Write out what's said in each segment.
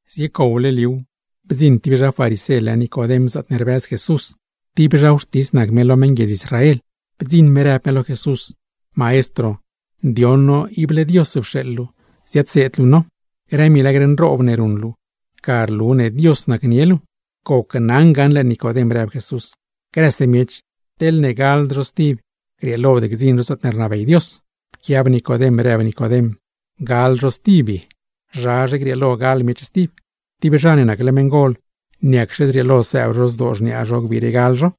Ziecowle liuw, bdziṉ tib zha farisé lë Nicodem zaatne rbëz Jesús; tib zha non nac me lo meṉguiedz Israel. Bdziṉ me rëb me lo Jesús: ―Maestro, ndioṉ no ible Dios pxeeḻ luu ziadseed luu no. Grë milagr nroob ne ruṉ luu, ga rlu ne Dios nacnie luu. ―Gneli naa lo luu gaṉle Nicodem ―rëb Jesús―, grëse miech, teḻne gald zho stib grieelod gdziṉ zho zaatne rnabey Dios. Pquiab Nicodem, rëb Nicodem: ―¿Gal zho stib ye? ¿Zha grieelo gal miech stib? Tib zha ne nacle meṉgol, ¿niacxe zrieelo sëëb zho zdoo xniaa zho gbiire gal zho?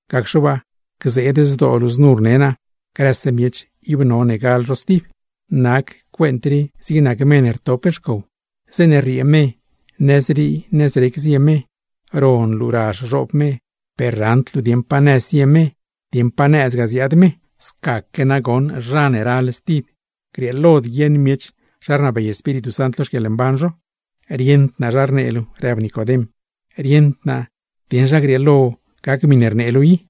Gacxe waa, gzeed zdoo luu znu rne naa: “Grëse miech, ib none gal zho stib.” Nac cuent rii zig nac me ne rtop xcow, zeeṉe rriee me, nëzrii nëz rec zie me, ron luu razh zhoob me; per raṉd luu dieṉ pa nëz zie me dieṉ pa nëz ziaadgaa me. Scaque nagoṉ nac zha ne ral stib, grieelod guieṉ miech zha rnabey Espíritu Sant lo xquieḻmban zho. ―Rieṉd naa zha rnee luu ―rëb Nicodem―. ¡Rieṉd naa dieṉ zha grieelo gac grë miṉe rnee luu i!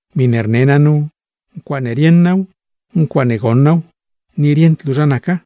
Miṉe rne naa nu ncuaaṉe rieṉ naaw, ncuaaṉe goṉ naaw, ni rieṉde to zha naca.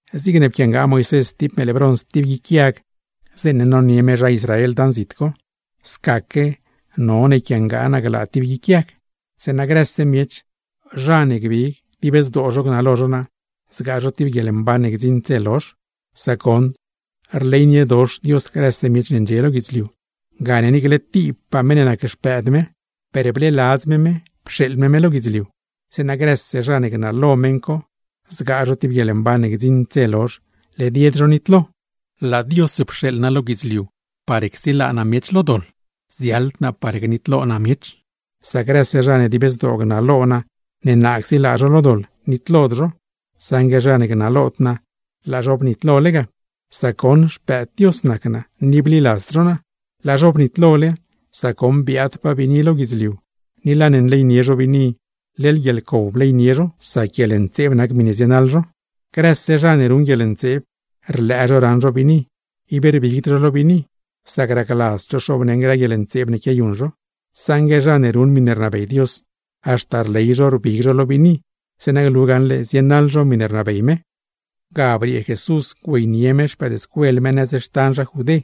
Ni zigne pquiangaa Moisés tib meeḻ brons tib guic yag zeeṉe nonie me zha Israel dan zit co; scaque none yquiangaa naa tib lo yag, zeeṉa grëse miech, zha ne gbig dib zdoo zho gnalo zho naa, zgaa zho tib guieḻmban ne gdziṉd dze lozh. Sac goṉ rleyniedox Dios grëse miech ne ndxie lo guidzliu; gane niicle tib naa nac mëëd lo me per laa me pxeeḻ naa lo guidzliu; zeeṉa grëse zha ne gnalo naa, zgaa zho tib guieḻmban ne gdziṉd dze lozh; led yed zho nitlo. Laa Dios pxeeḻ naa lo guidzliu par csilaa naa miech lo doḻ, ziaḻd naa par gdziibdoḻ naa miech. Sac grëse zha ne dib zdoo gnalo naa ne naa csilaa zho lo doḻ, nitlod zho. Saṉgue zha ne gnalod naa, laa zho bnitlole ga, sac goṉ Xpëëd Dios nac naa ni bliladzd zho naa. Laa zho bnitlole, sac goṉ biaadpaa biini lo guidzliu ni laa ne nleynie zho biini, leḻ guieḻcow bleynie zho, sac guieḻntseeb nac miṉe zienaḻ zho. Grëse zha ne ruṉ guieḻntseeb, rlëë zho raṉ zho biini. Ib rbigd zho lo biini, sac racladzd zho xoobneṉ grë guieḻntseeb ne quiayuṉ zho. Saṉgue zha ne ruṉ miṉe rnabey Dios, haxta rley zho rbig zho lo biini, zeeṉa glu gaṉle zienaḻ zho miṉe rnabey me. Ga briee Jesús güeynie me no nëz xtan zha Judé.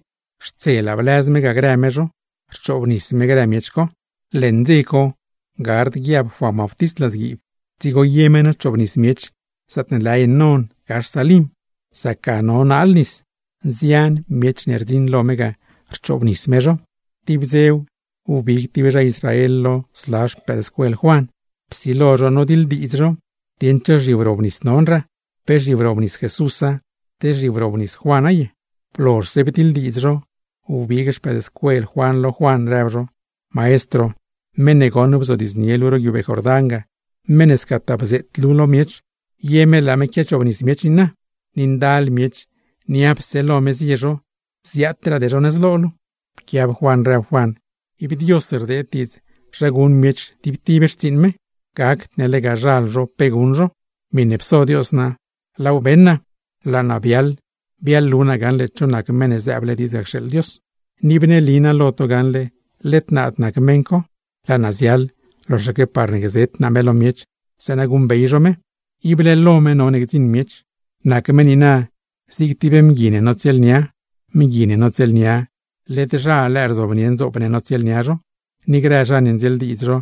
Xtselaa bliaaz no ga grë no me, rchoobnis me grë miech co. Leṉ dze co gard guiab Juan Bautist ladzguiib; dzigo ye me nochoobnis miech zaatne lë Enón gax Salim; sac ga no naal nis. Nzian miech ne rdziṉ lo me ga, rchoobnis me zho. Tib dzew, wbig tib zha Israel lo zla xpëëdscuel Juan, psilo zho nodiḻdiidz zho dieṉ cho zhiwrobnis nonraa; pe zhiwrobnis Jesúsa, te zhiwrobnis Juana ye. Blozhse bdiḻdiidz zho, wbig xpëëdscuel Juan lo Juan, rëb zho: ―Maestro, meṉ ne goṉ bzodiidznie luu ro guiubee Jordán ga, meṉ ne scataa bzeet luu lo miech, ¡ye me laa me quiachoobnis miech niina, ni ndal miech niapse lo me zie zho, ziaatraade zho nëz rii! Pquiab Juan rëb Juan: ―Ib Dios rdeed diidz zha guṉ miech tib tib xtsiiṉ me, gacd ne lega zhal zho guṉ zho pe cos. Miṉe pso Dios naa, laaw beṉ naa: laa naa biaḻlu gaṉle cho nac Meṉ ne zëëble diidz ga cxeeḻ Dios. Ni bneeli naa lo to gaṉle led naad nac meṉ co; laa naa ziaḻ loxaque par gzet naa me lo miech zeeṉa guṉbey zho me. Ible lo me none gdziṉ miech. Nac me niina zig tib mgui ne notsieelnia: Mgui ne notsieelnia, ¡led zha lëë rzobnie ndzoop ne notsieelnia zho! Ni grë zha ne ndzieeldiidz zho,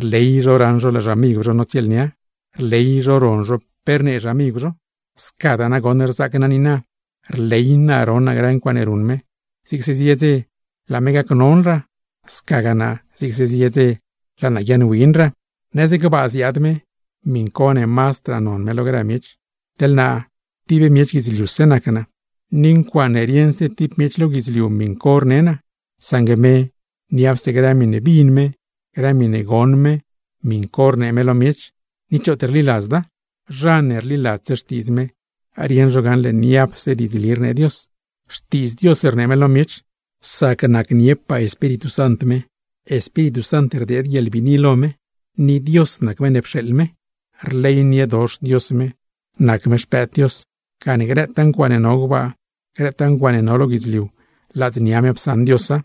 rley zho raṉ zho laa xamigw zho notsieelnia, rley zho ron zho pe rnee xamigw zho. Scadaa nagoṉ rzaac naa niina: rley naa ron naa grë ncuaaṉe ruṉ me. Zigse zie dze, laa me gacnonraa; scagaa naa, zigse zie dze laa naa guiaaṉwinraa. ’Nëz gbaa ziaad me, miṉ co ne mazdraa non me lo grë miech. Teḻ naa tib miech guidzliuse nac naa, ni ncuaaṉe rieṉse tib miech lo guidzliu miṉ co rne naa; saṉgue me, niapse grë miṉe bin me, grë miṉe goṉ me miṉ co rnee me lo miech; ¡ni choot rliladzda! Zha ne rliladzse xtiidz me, rieṉ zho gaṉle niapse diidzli rnee Dios. Xtiidz Dios rnee me lo miech; sac Espíritu Sant rdeed guieḻbiini lo me, ni Dios nac meṉ ne pxeeḻ me. Rleyniedox Dios me, nac me Xpëëd Dios; gane grëtaa ncuaaṉe no gbaa, no lo guidzliu, ladznia me psaṉ Diosa.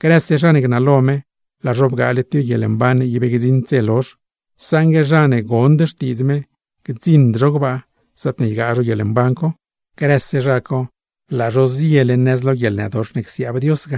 Grëse zha ne gnalo me, laa zho bgaale tib guieḻmban ne ib gdziṉd dze lozh; saṉgue zha ne gond xtiidz me, gdziṉd zho gbaa, zaatne ygaa zho guieḻmban co. ¡Grëse zha co, ible zgaa zho guieḻnëdox ne csiaab Dios!